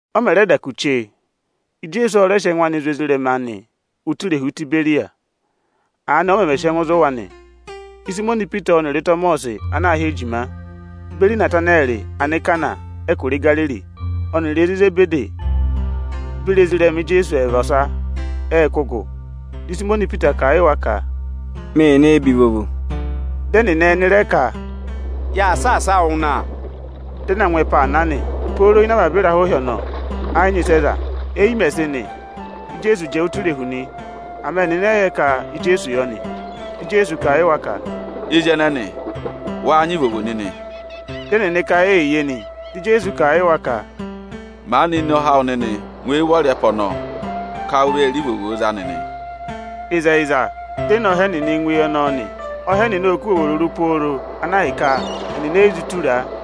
Ọ mẹ̀ rẹ da kù chee, Ijeesu ọ rẹ sị ẹngụ anị zụ̀ ezirẹma anị ụtọ irehu Itiberiyasi. Aanị ọ mẹmẹ sị ẹngụ zụ̀ wa nị: Ịsayịmọnị Ipita ọnịrị Ịtọmọsị ana aā hị́ Ejima, beri Inatanẹrị Anikana ịnị ẹtẹ Igariri, ọnịrị ezi Izebedi beri ezirẹma Ijeesu ẹẹva ọsa ệ kụ́ gụ. Dị Ịsayịmọnị Ipita kà a yị wa ka, “Mee nee be ivovo.” Dị ẹnịnị ẹnị rẹ ka, “Yaa saasa wụụ na.” Dị ẹ na ngụ ẹpa aa na nị. Pooro ịnị avaba ịrahụ ịhị ọnọọ, ẹ yị nyị ịsị ẹ za. Éyi mẹ̀ sị nị, di Ijeesu jẹẹ ụtọ irehu nị. Ama ẹnịnị ẹ yị yẹ ka Ijeesu yọ nị. Dị Ijeesu kà a yị wa ka, “Ezi ẹnẹnị, wáá nyị ivovo nịnị?” Dị ẹnịnị ka eyiye nị. Dị Ijeesu kà a yị wa ka, “Maanị ne ọha awụ nịnị ngụ eyi ụvọrị ẹpa ọnọọ ka u vee re ivovoo za nịnị!” Ịzẹyịza, di e ne ọha ẹnịnị ngụ eyi ọnọọ nị. Ọha ẹnịnị ộ kụ́ ivovo rụrụ pooro ana ahịka, ẹnịnị e yi zụ tura a.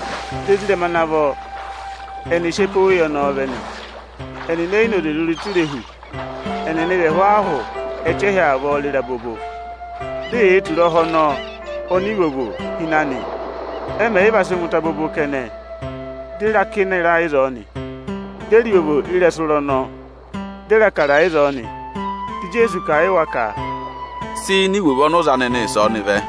Di ezirẹma ana vọ ẹnị sị ẹpa oweyi ọnọọ vẹ nị. Ẹnịnị e yi noze rịrị ụtọ irehu, ẹnịnị vị ẹhụụ ahụ ẹchẹhị avọọ rịrị abobo. Di eyee tura ọha ọnọọ oni ivovo hi ịnị anị nị. Ẹ mẹ̀ yị va sị ngụ ụtọ abobo kẹnẹ, di e re akịna ịra ịzọọ nị. Di e re ivovo ị́rẹsụ ịra ọnọọ, di re Ịbụrẹẹdị ịzọọ nị. Di Ijeesu kà a yị wa ka, “Sị ini ivovo ọnị ụ za nịnị ịsọọnị vẹ!”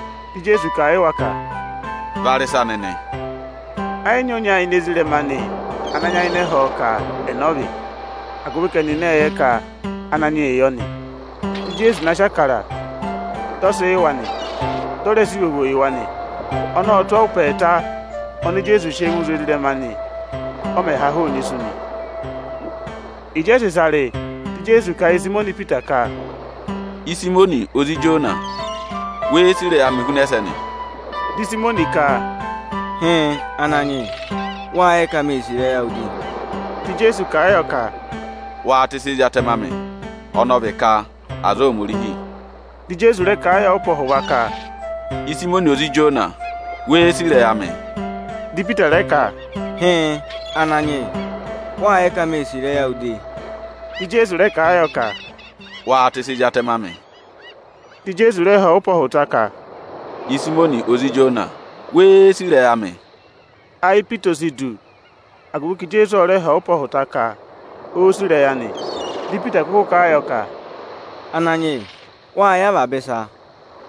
Dị Ijeesu kà a yị wa ka, “Va rị ịsa nịnị!” Ẹ yị nyị ọnya ini ezirẹma anị ana nyayịnẹ ẹ họ̀ ọ ka ẹnẹ ọ vị, agụvị ka ẹnịnị ệ yẹ ka Ananyị yịị yọ nị. Dị Ijeesu na sị Ịbụrẹẹdị, dị ọ sị yị wa nị. Dị ọ rẹ sị ivovo yị wa nị. Ọnọọ ọ tụ́ ọọ ụpẹ ọhụta oni Ijeesu sị ẹngụ zụ̀ ezirẹma anị, ọ mẹ̀ ha hụụnị isu nị. Ịjị ẹ sị ịsa rị, dị Ijeesu kà a yị Ịsayịmọnị Ipita ka, “Ịsayịmọnị, ozi Ijona, wéé sì ịrẹyị amị huna ẹsẹnị?” Dị Ịsayịmọnị ka, “Hịịn, Ananyị yị, wâ yẹ ka mê sì ịrẹyị awụ de.” Dị Ijeesu kà a yọ ka, “Waa tẹsị ezi atẹmẹ amị o!” (Ọnọọ vị ka ‘aza Ohomorihi’.) Dị Ijeesu rẹ kà a yọ ụpẹ ọhụva ka, “Ịsayịmọnị, ozi Ijona, wéé sì ịrẹyị amị?” Dị Ipita rẹ ka, “Hịịn, Ananyị yị, wâ yẹ ka mê sì ịrẹyị awụ de.” Dị Ijeesu rẹ kà a yọ ka, “Waa tẹsị ezi atẹmẹ amị o!” Dị Ijeesu rẹ họ̀ ọ ụpẹ ọhụta ka, “Ịsayịmọnị, ozi Ijona, wéé sì ịrẹyị amị?” Ayị Ipita o si du, agụvị ka Ijeesu ọ rẹ họ̀ ọ ụpẹ ọhụta ka óó sì ịrẹyị anị. Dị Ipita kụkụ kà a yọ ka, “Ananyị yị, wâ yẹ avaba ịsa,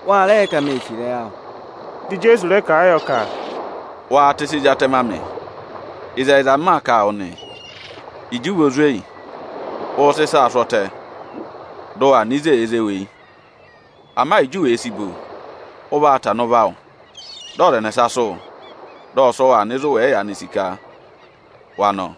wa rẹ yẹ ka mê sì ịrẹyị awụ.” Dị Ijeesu rẹ kà a yọ ka, “Waa tẹsị ezi atẹmẹ amị! Ịzẹyịza m maa kà a wụ nị, ịjị ụ vị ozweyi, ụụ̄ sị ịsaa sụ́ ọtẹ, dị ụ waa nọ ịzị èe zé wu eyi. Ama Ịjị u wèe si bo, ụ vaa tana ụvọ awụ, dị ọza ẹnẹsa sụ́ wụ, dị ọ sị wụ aa nọ ịzị ụ wẹ̀ yị yaanị sì ka wa nọ.”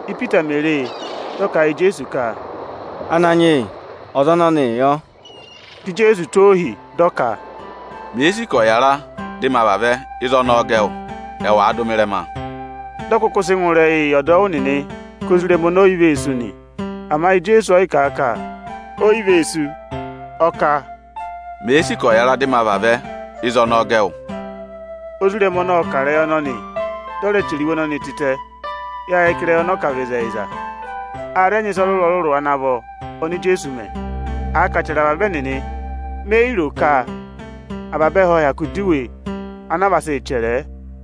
Ípita mèe re e, dị ọ kà a yị Ijeesu ka, “Ananyị yị, ọza ọnọnịị yọ?” Dị Ijeesu tụ́ ọ ohi, dị ọ ka, “Mèe sì ka ọ̀ yàra dị ma vavẹ, ịzị ọnọọ gẹ wụ? Ẹwàa dụ mị ịrẹma!” Dị ọ kụkụ sị ngụ ịrẹyị yị ọdọwụ nịnị ka ozirẹma ọnọọ o yi vee sú nị. Ama Ijeesu ọ yị kà a ka, “O yi vee sú”, ọ ka, “Mèe sì ka ọ̀ yàra dị ma vavẹ, ịzị ọnọọ gẹ wụ?” Ozirẹma ọnọọ ọ kà ịrẹyị ọnọnị, dị ọ rẹ chẹrẹ iwe ọnọnị tịtẹ nị. Yâ yẹ ka ịrẹyị ọnọọ kà vị ịzẹyịza A rẹ nyị ịsa ọrụrụ-ọrụrụ ana vọ oni Ijeesu mẹ. Àa ka à chẹrẹ avaba ẹnịnị, me yi ro ka avaba ẹhẹ ộ hyakụ dọ iwe ana a vaa sị chẹrẹ ẹ.